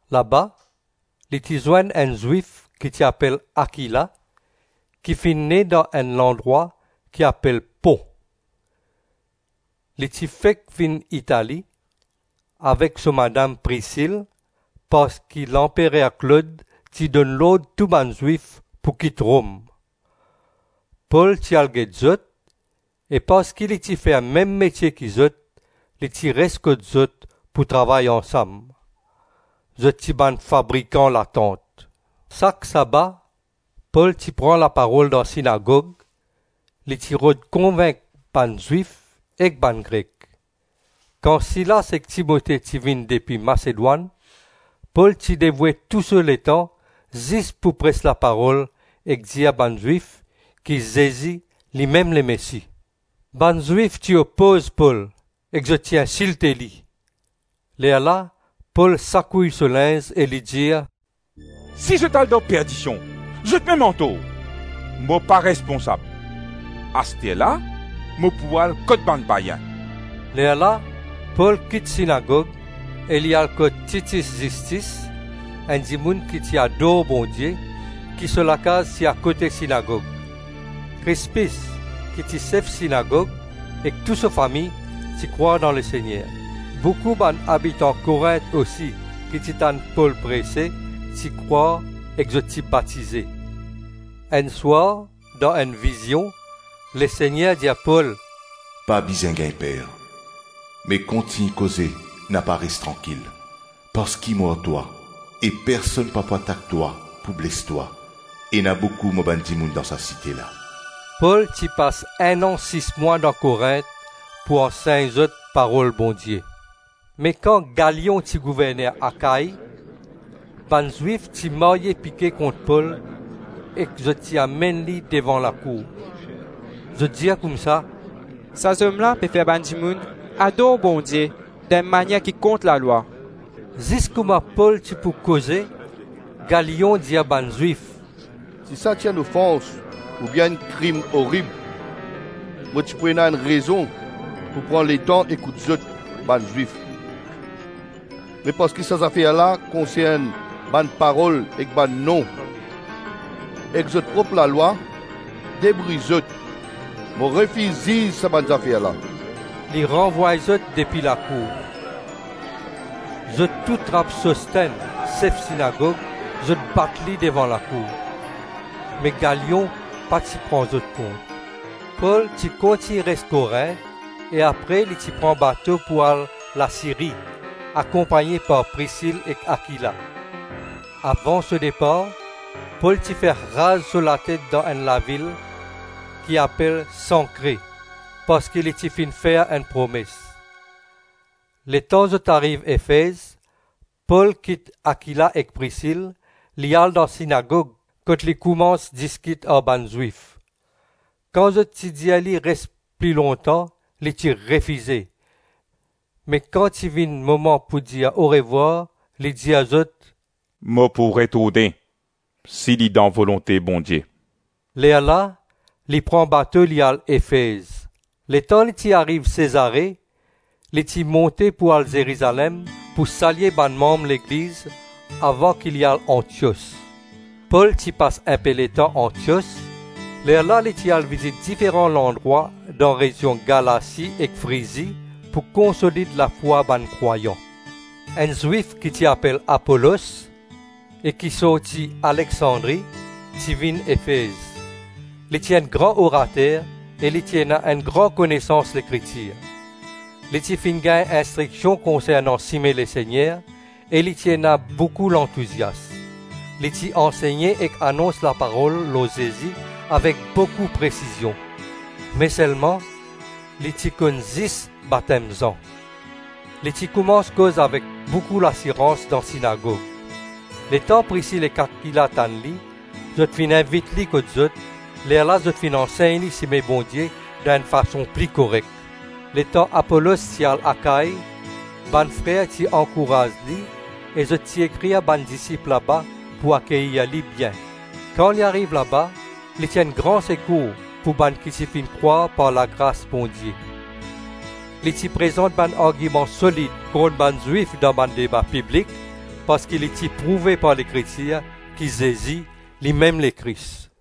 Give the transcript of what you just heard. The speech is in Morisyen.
Laba li ti zwenn enn Zwif ki ti apel Akila, ki finn ne dan enn landrwa ki apel Pon. Li ti fek vinn Itali avek so madam Prisil, parski lanperer Klod ti donn lord tou bann Zwif pou kit Rom. Pol ti al get zot, e parski li ti fer mem metie ki zot, li ti res kot zot pou travay ansam. Zot ti bann fabrikan latant. Sak saba Pol ti pran laparol dan sinagog, li ti rod konvink bann Zwif ek bann Grek. Kan Silas ek Timote ti vinn depi Masedwann, Pol ti devoue tou so letan zis pou pres laparol ek dir bann Zwif ki Zezi limem Lemesi. Bann Zwif ti opoz Pol ek zot ti insilte li, lerla Pol sakouy so linz e li dir, “Si zot al dan perdision, zotmem antor! Mo pa responsab. Asterla mo pou al kot bann payin.” Lerla Pol kit sinagog e li al kot Tityis Zistis enn dimoun ki ti ador Bondie, ki so lakaz ti akote sinagog. Krispis ki ti sef sinagog ek tou so fami ti krwar dan Lesegner. Boukou bann abitan Korint osi ki ti tann Pol prese, ti krwar ek zot ti batize. Enn swar dan enn vizion Lesegner dir Pol, “Pa bizin gagn per, me kontign koze, napa res trankil; parski mo ar twa e personn pa pou atak twa pou bles twa; ena boukou mo bann dimoun dan sa site la.” Pol ti pas enn-an sis-mwa dan Korint pou ansegn zot parol Bondie. Me kan Galyon ti gouverner Akai bann Zwif ti marye pike kont Pol ek zot ti amenn li devan lakour. Zot dir koumsa, “Sa zom la pe fer bann dimoun ador Bondie dan enn manier ki kont lalwa.” Zis kouma Pol ti pou koze, Galyon dir bann Zwif, “Si sa ti enn ofans oubien enn krim orib mo ti pou ena enn rezon pou pran letan ekout zot, bann Zwif; me parski sa zafer la konsern bann parol ek bann nom, ek zot prop lalwa, debrouy zot; mo refiz ziz sa bann zafer la.” Li ranvway zot depi lakour. Zot tou trap Sostenn, sef sinagog, zot bat li devan lakour. Me Galyon pa ti pran zot kont. Pol ti kontign res Korint e apre li ti pran bato pou al Lasiri, akonpagne par Prisil ek Akila. Avan so depar Pol ti fer raz so latet dan enn lavil ki apel Sankre, parski li ti finn fer enn promes. Letan zot ariv Efez, Pol kit Akila ek Prisil, li al dan sinagog kot li koumans diskit ar bann Zwif. Kan zot ti dir li res pli lontan, li ti refize, me kan ti vinn moman pou dir orevwar, li dir zot, “Mo pou retourne si li dan volonte Bondie.” Lerla li pran bato li al Efez. Letan li ti ariv Sezare, li ti monte pou al Zerizalem pou salye bann manm legliz, avan ki li al Antios. Pol ti pas inpe letan Antios, lerla li ti al vizit diferan landrwa dan rezion Galasi ek Frizi, pou konsolid lafwa bann krwayan. Enn Zwif ki ti apel Apolos, e ki sorti Aleksandri, ti vinn Efez. Li ti enn gran orater, e li ti ena enn gran konesans Lekritir. Li ti finn gagn instriksion konsernan Sime Lesegner, e li ti ena boukou lantousias. Li ti ansegne ek anons laparol lor Zezi avek boukou presizion. Me selma li ti konn zis batem Zan. Li ti koumans koz avek boukou lasirans dan sinagog. Letan Prisil ek Akila ti tann li, zot finn invit li kot zot, lerla zot finn ansegn li sime Bondie dan enn fason pli korek. Letan Apolos ti le al Akai, bann frer ti ankouraz li e zot ti ekrir bann disip laba pou akeyir li bien. Kan li ariv laba, li ti enn gran sekour pou bann ki ti finn krwar par lagras Bondie. Li ti prezant bann argiman solid kont bann Zwif dan deba piblik, parski li ti prouve par Lekritir ki Zezi, limem Lekris.